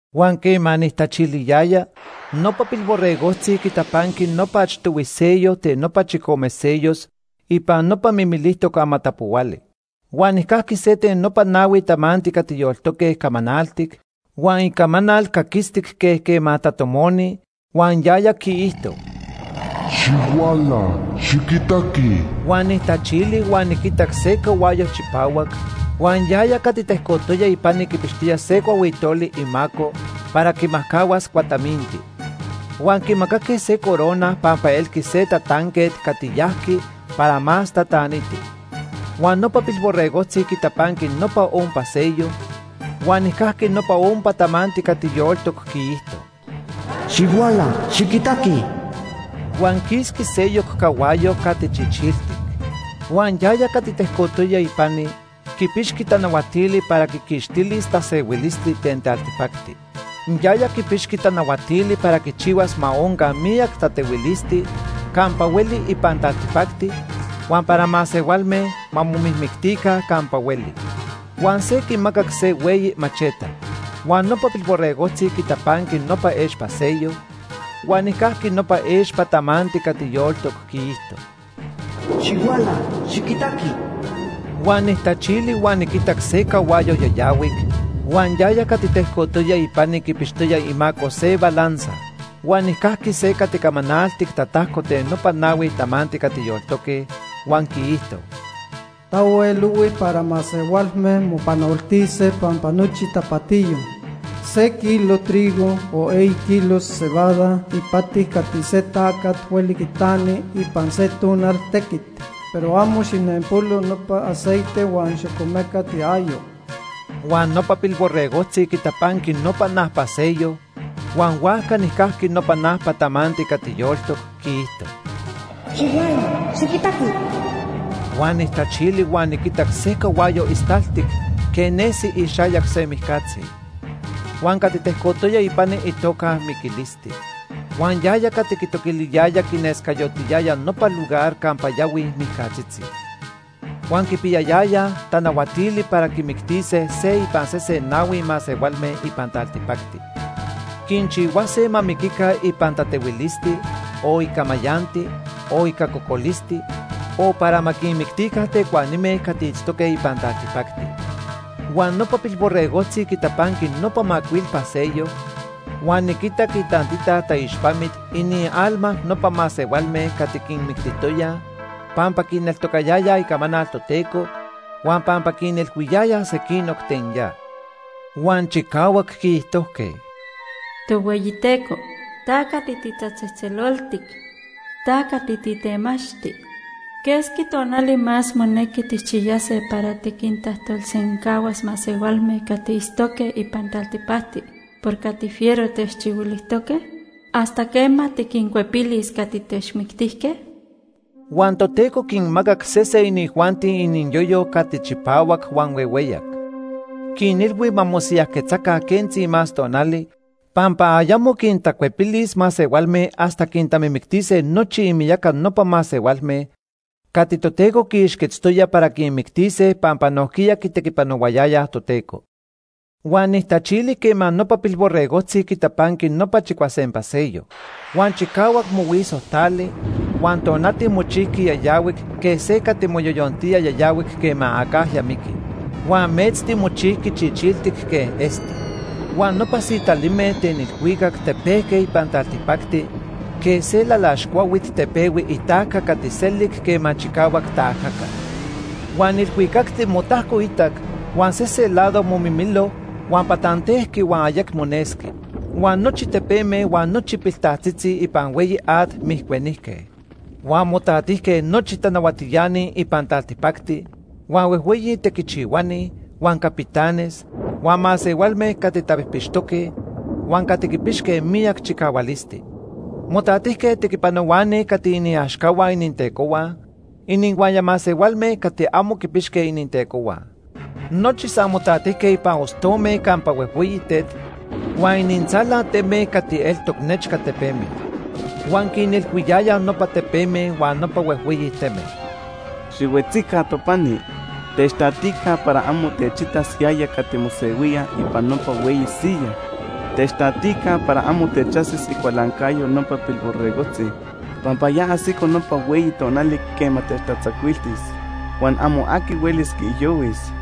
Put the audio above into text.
Huan quema nijtachiliyaya, nopa Pilborregojtzi quitapanqui nopa achtohui sello ten nopa chicome sellos ipan nopa mimilijtoc amatapohuali. Huan nijcajqui se ten nopa nahui tamanti cati yoltoque camanaltic huan icamanal caquistic quej quema tatomoni, huan yaya quiijto: “¡Xihuala, xiquitaqui!” Huan nijtachili huan niquitac se cahuayo chipahuac, huan yaya cati tejcotoya ipani quipixtoya se cuahuitoli imaco para quimajcahuas cuataminti. Huan quimacaque se corona pampa elqui se tatanquet cati yajqui para más tataniti. Huan nopa Pilborregojtzi quitapanqui nopa ompa sello, huan nijcajqui nopa ompa tamanti cati yoltoc quiijto: “¡Xihuala, xiquitaqui!” Huan quisqui seyoc cahuayo cati chichiltic. Huan yaya cati tejcotoya ipani quipixqui tanahuatili para quiquixtilis tasehuilisti ten taltipacti. Yaya quipixqui tanahuatili para quichihuas ma onca miyac tatehuilisti campa hueli ipan taltipacti huan para masehualme ma momijmictica campa hueli. Huan se quimacac se hueyi macheta. Huan nopa Pilborregojtzi quitapanqui nopa expa sello, huan nijcajqui nopa expa tamanti cati yoltoc quiijto: “¡Xihuala, xiquitaqui!” Huan nijtachili huan niquitac se cahuayo yayahuic, huan yaya cati tejcotoya ipani quipixtoya imaco se balanza. Huan nijcajqui se cati camanaltic tatajco ten nopa nahui tamanti cati yoltoque, huan quiijto: “Tahuel ohui para masehualme mopanoltise pampa nochi tapatiyo. Se kilo trigo o eyi kilos cebada ipati cati se tacat hueli quitani ipan se tonal tequit, pero amo xijnenpolo nopa aceite huan xocomecat iayo.” Huan nopa Pilborregojtzi quitapanqui nopa najpa sello, huan huajca nijcajqui nopa najpa tamanti cati yoltoc quiijto: “¡Xihuala, xiquitaqui!” Huan nijtachili huan niquitac se cahuayo istaltic quej nesi ixayac se mijcatzi. Huan cati tejcotoya ipani itoca Miquilisti. Huan yaya cati quitoquiliyaya quinescayotiyaya nopa lugar campa yahuij mijcatzitzi. Huan quipiyayayaj tanahuatili para quimictise se ipan sese nahui masehualme ipan taltipacti. Quinchihuase ma miquica ipan tatehuilisti, o ica mayanti, o ica cocolisti, o para ma quinmictica tecuanime cati itztoque ipan taltipacti. Huan nopa Pilborregojtzi quitapanqui nopa macuilpa sello, huan niquitac itantita taixpamit inialma nopa masehualme cati quinmictijtoyaj pampa quineltocayayaj icamanal Toteco huan pampa quinilhuiyayaj sequinoc ten ya. Huan chicahuac quiijtojque: “Tohueyiteco, ta cati titatzejtzeloltic. Ta cati titemachti. ¿Quesqui tonali más monequi tijchiyase para tiquintajtolsencahuas masehualme cati itztoque ipan taltipacti por cati fiero techchihuilijtoque? ¿Hasta quema tiquincuepilis cati techmictijque?” Huan Toteco quinmacac sese inijuanti iniyoyo cati chipahuac huan huehueyac. Quinilhui ma mosiyajquetzaca quentzi más tonali pampa ayamo tecuepilis masehualme hasta quintamimictise nochi imiyaca nopa masehualme cati Toteco quiixquetztoya para quinmictise pampa nojquiya quitequipanohuayayaj Toteco. Huan nijtachili quema nopa Pilborregojtzi quitapanqui nopa chicuasempa sello. Huan chicahuac mohuiso tali, huan tonati mochijqui yayahuic quej se cati moyoyontía yayahuic quema acajya miqui. Huan metzti mochijqui chichiltic quej esti. Huan nopa sitalime ten ilhuicac tepejque ipan taltipacti quej se lalax cuahuit tepehui itajca cati selic quema chicahuac taajaca. Huan ilhuicacti motajcoitac huan sese lado momimilo huan patantejqui huan ayecmo nesqui. Huan nochi tepeme huan nochi piltaltzitzi ipan hueyi at mijcuenijque. Huan motatijque nochi tanahuatiani ipan taltipacti, huan huejhueyi tequichihuani, huan capitanes, huan masehualme cati tapijpixtoque, huan cati quipixque miyac chicahualisti. Motatijque tequipanohuani cati iniaxcahua inintecohua, inihuaya masehualme cati amo quipixque inintecohua. Nochi san motatijque ipan ostome campa huejhueyi tet huan inintzala teme cati eltoc nechca tepeme. Huan quinilhuiyayaj nopa tepeme huan nopa huejhueyi teme: “Xihuetzica topani. Techtatica para amo techitas yaya cati mosehuía ipan nopa hueyi siyaj. Techtatica para amo techajsis icualancayo nopa Pilborregojtzi. Pampa ya ajsico nopa hueyi tonali quema techtatzacuiltis huan amo aqui huelis quiijyohuis.”